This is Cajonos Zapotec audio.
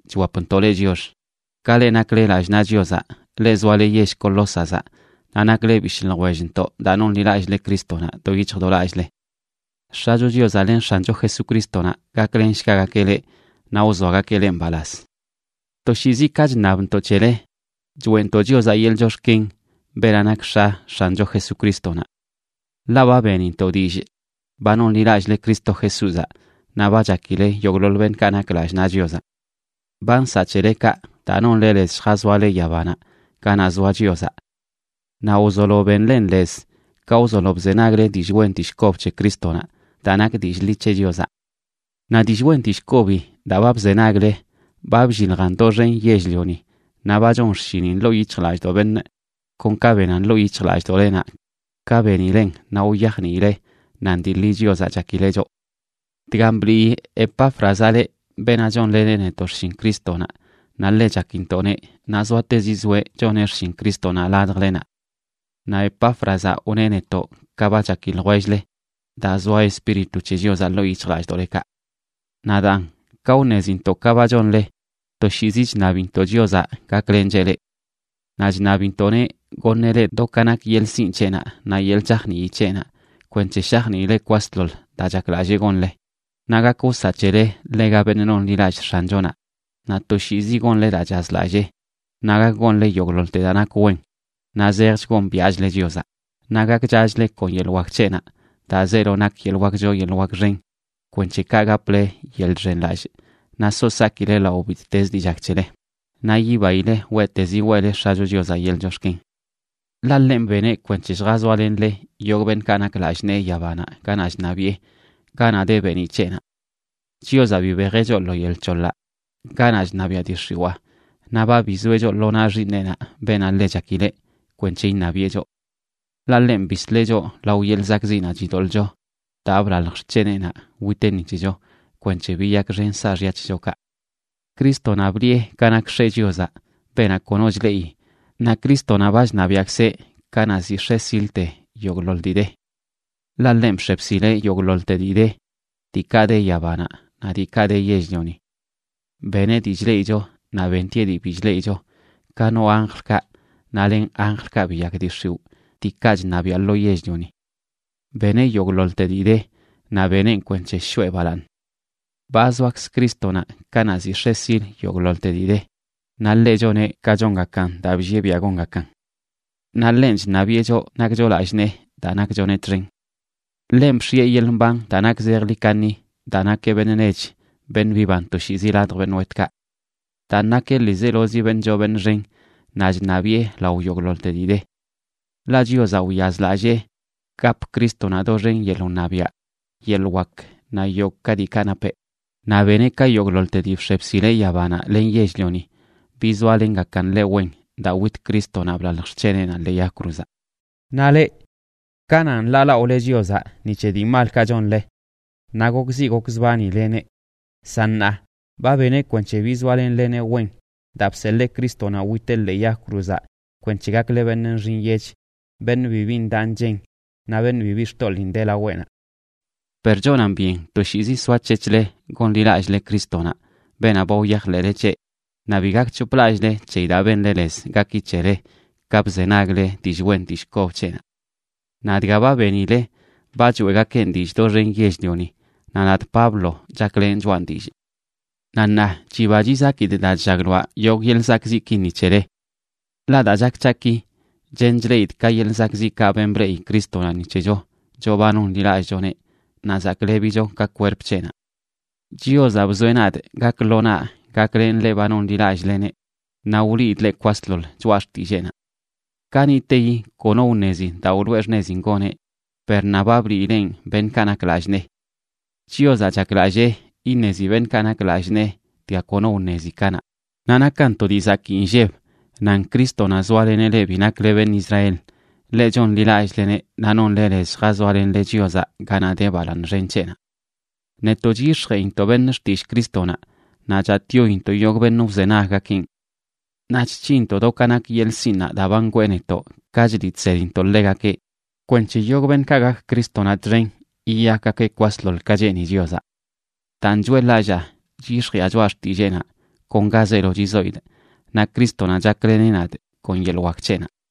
chwapntoꞌ leꞌ chiox, ka le nakle lallꞌ naꞌ Chiozaꞌ, leꞌ zoale yell Colósazaꞌ, naꞌ nakle bishꞌ ljwellntoꞌ daa nonḻilallꞌle Crístonaꞌ do yic̱hj do lallꞌle. X̱acho Chiozaꞌ len X̱ancho Jesucrístonaꞌ gaklenshgagakeꞌ leꞌ naꞌ wzoagakeꞌ leꞌ mbalaz. Toshiizi ka chṉabntoꞌ c̱hele, choeꞌntoꞌ Chiozaꞌ yeḻꞌ chox̱ken, beenaꞌ nak X̱a X̱ancho Jesucrístonaꞌ. Ḻaꞌ ba benintoꞌ dillꞌ ba nonḻilallꞌle Cristo Jesúzaꞌ naꞌ ba chakile yogꞌḻoḻ beṉꞌkaꞌ nak lallꞌ naꞌ Chiozaꞌ. Ba nsaꞌ c̱hele kaꞌ daa nonle lez lljazoale yabanaꞌ ganaꞌ zoa Chiozaꞌ. Naꞌ wzolo benlen lez ka wzolo bzenagle dillꞌ wen dillꞌ kob c̱he Crístonaꞌ daa nak dillꞌ ḻi c̱he Chiozaꞌ. Naꞌ dillꞌ wen dillꞌ kobi daa ba bzenagle ba blliljan doxen yell-lioni naꞌ ba chon xshinin ḻoo yic̱hjlallꞌdoꞌ beṉꞌ, kon ka benan ḻoo yic̱hjlallꞌdoꞌlenaꞌ ka benilen naꞌ wyajniile nan dii ḻi Chiozaꞌ chakileꞌ choꞌ. Dgan blii Epáfrazaꞌ leꞌ, beenaꞌ chonleneꞌ netoꞌ xshin Crístonaꞌ naꞌ ḻe chakintoꞌneꞌ, naꞌ zoatezi zoeꞌ choneꞌ xshin Crístonaꞌ ladjlenaꞌ. Naꞌ Epáfrazaꞌ wneꞌ netoꞌ ka ba chaki ljwell-le daa zoa Espíritu c̱he Chiozaꞌ ḻoo yic̱hjlallꞌdoꞌlekaꞌ. Naꞌ daan, ka wṉezintoꞌ ka ba chonle, toshiizi chṉabintoꞌ Chiozaꞌ gaklencheꞌ leꞌ. Naꞌ chṉabintoꞌneꞌ goṉeꞌ leꞌ do ka nak yeḻꞌ sinꞌ c̱heꞌnaꞌ naꞌ yeḻꞌ chajnii c̱heꞌnaꞌ kwenc̱he shajniile kwasḻoḻ daa chaklallee gonle, naꞌ gak wsaꞌ c̱hele ḻega beṉꞌ nonḻilallꞌ X̱anchonaꞌ, naꞌ toshiizi gonle daa chazlallee, naꞌ gak gonle yogꞌḻoḻte daa nak wen, naꞌ zejch gombiaꞌchle Chiozaꞌ, naꞌ gakchachle kon yeḻꞌ wak c̱heꞌnaꞌ daa zeelo nak yeḻꞌ wak choo yeḻꞌ wak xen kwenc̱he kaꞌ gaple yeḻꞌ chxenlallꞌ naꞌ so sakile lao bittezə dii chak c̱hele, naꞌ yibaile weꞌtezi weꞌle X̱acho Chiozaꞌ yeḻꞌ chox̱ken. Ḻaꞌ ḻenꞌ beneꞌ kwenc̱he lljazoalenle yogꞌ beṉꞌkaꞌ nak lallꞌ nee yabanaꞌ ganaꞌ chṉabiꞌe, ganaꞌ de beeniꞌ c̱heꞌnaꞌ. Chiozaꞌ bibejeꞌ choꞌ lo yel c̱hoḻaꞌ ganaꞌ chṉabiaꞌ dii x̱iwaa naꞌ ba bizoeꞌ choꞌ lo naꞌ Xiiṉeꞌnaꞌ, beenaꞌ ḻe chakileꞌ, kwenc̱he iṉabiꞌe choꞌ. Ḻaꞌ ḻenꞌ bisleꞌ choꞌ lao yeḻꞌ zakꞌziꞌnaꞌ chidoḻꞌcho daa blalj xc̱heneꞌnaꞌ witeꞌ ni c̱hecho kwenc̱he biyakxen saaxya c̱hechokaꞌ. Crístonaꞌ bliꞌe ka nak X̱e Chiozaꞌ, beenaꞌ kono chleꞌi, naꞌ Crístonaꞌ ba chṉabiaꞌkzeꞌ kanaꞌ ziꞌ x̱e silte yogꞌḻoḻ dii de. Ḻaꞌ ḻenꞌ bx̱e bsileꞌ yogꞌḻoḻte dii de: diikaꞌ de yabanaꞌ naꞌ diikaꞌ de yell-lioni. Beneꞌ dii chleꞌicho naꞌ bentieꞌ dii bi chleꞌicho, ka no anjlkaꞌ naꞌ len anjlkaꞌ biyak dii x̱iwꞌ diikaꞌ chṉabiaꞌ lo yell-lioni. Beneꞌ yogꞌḻoḻte dii de, naꞌ beneꞌn kwenc̱he shoꞌe balaaṉ. Ba zoakz Crístonaꞌ kanaꞌ ziꞌ x̱e sil yogꞌḻoḻte dii de, naꞌ ḻeꞌ choneꞌ ka chongakan daa bllieꞌ biaꞌ gongakan. Naꞌ ḻenꞌ chṉabiꞌe choꞌ nakcho lallꞌ nee, daa nakchoneꞌ txen. Ḻenꞌ bx̱ieꞌ yeḻꞌ mban daa nak zejḻi kaṉi daa nakeꞌ beṉꞌ nech beṉꞌ biban toshiizi ladj beṉꞌ wetꞌkaꞌ. Daan, nakeꞌ ḻiizelozi beṉꞌ choo beṉꞌ xen naꞌ chṉabiꞌe lao yogꞌḻoḻte dii de. Ḻaꞌ Chiozaꞌ wyazlallee gap Crístonaꞌ doxen yeḻꞌ wṉabiaꞌ, yeḻꞌ wak naꞌ yogꞌ ka diikaꞌ napeꞌ, naꞌ beneꞌ ka yogꞌḻoḻte dii bx̱e bsileꞌ yabanaꞌ len yell-lioni bizoalengakan ḻeꞌ wen daa wit Crístonaꞌ, blalj xc̱heneꞌnaꞌ ḻee yag cruzaꞌ. Naꞌ leꞌ, kananꞌ nḻaalaꞌole Chiozaꞌ ni c̱he dii malkaꞌ chonle naꞌ gokziꞌ gokzbanileneꞌ. San ṉaa, ba beneꞌ kwenc̱he bizoalenleneꞌ wen daa bseḻee Crístonaꞌ witeꞌ ḻee yag cruzaꞌ kwenc̱he gakle beṉꞌ nxi nyech, beṉꞌ bibi ndaꞌ nchen naꞌ beṉꞌ bibi xtoḻiin de laweꞌnaꞌ. Per chonan byen toshiizi soac̱hec̱hle gonḻilallꞌle Crístonaꞌ, beenaꞌ ba wyajḻeꞌle c̱heꞌ, naꞌ bi gakc̱hoplallꞌle c̱heyi daa benle lez gaki c̱hele ka bzenagle dillꞌ wen dillꞌ kob c̱heꞌnaꞌ. Naꞌ dga ba benile, ba choeꞌgakeꞌn dillꞌ doxen yell-lioni, naꞌ nadꞌ Pablo, chaklenꞌ choꞌan dillꞌ. Naꞌ ṉaa chiba chizakidꞌ daa chllagloaꞌ yogꞌ yeḻꞌ zakꞌziꞌki ni c̱hele. Ḻaꞌ daa chak c̱haꞌ ki, chen chleꞌidꞌ ka yeḻꞌ zakꞌziꞌkaꞌ ben bleꞌi Crístonaꞌ ni c̱hecho, choꞌ ba nonḻilallꞌchoneꞌ naꞌ zaklebicho ka kwerp c̱heꞌnaꞌ. Chiozaꞌ bzoeꞌ nadꞌ gak lo naꞌ gaklenꞌ leꞌ ba chonḻilallꞌleneꞌ naꞌ wliidꞌ leꞌ kwasḻoḻ choꞌa xtilleenaꞌ. Kaniꞌteyi kono wṉezi daa wloꞌe xṉezin goneꞌ, per ṉaa ba bliileꞌn beṉꞌkaꞌ nak lallꞌ nee. Chiozaꞌ chaklallee iṉezi beṉꞌkaꞌ nak lallꞌ nee dga kono wṉezi kanaꞌ, naꞌ nakan to dii zakii nlleb nan Crístonaꞌ zoaleneꞌ leꞌ bi nakle beṉꞌ Israel, leꞌ chonḻilallꞌleneꞌ, naꞌ nonle lez lljazoalenle Chiozaꞌ ganaꞌ de balaaṉ xen c̱heꞌnaꞌ. Netoꞌ chyix̱jeꞌintoꞌ beṉꞌ xtillꞌ Crístonaꞌ, naꞌ chatꞌyointoꞌ yogꞌ beṉꞌ wzenaggakeꞌn. Naꞌ chc̱hinntoꞌ do ka nak yeḻꞌ sinꞌnaꞌ daa ba ngwee netoꞌ ka chliꞌ chsedintoꞌ ḻegakeꞌ kwenc̱he yogꞌ beṉꞌkaꞌ gak Crístonaꞌ txen yiyakgakeꞌ kwasḻoḻ ka cheeni Chiozaꞌ. Daan, choeꞌḻ-lallaa chyix̱jiꞌa choꞌa xtilleenaꞌ kon ga zeelo chizoidꞌ, naꞌ Crístonaꞌ chakleneꞌ nadꞌ kon yeḻꞌ wak c̱heꞌnaꞌ.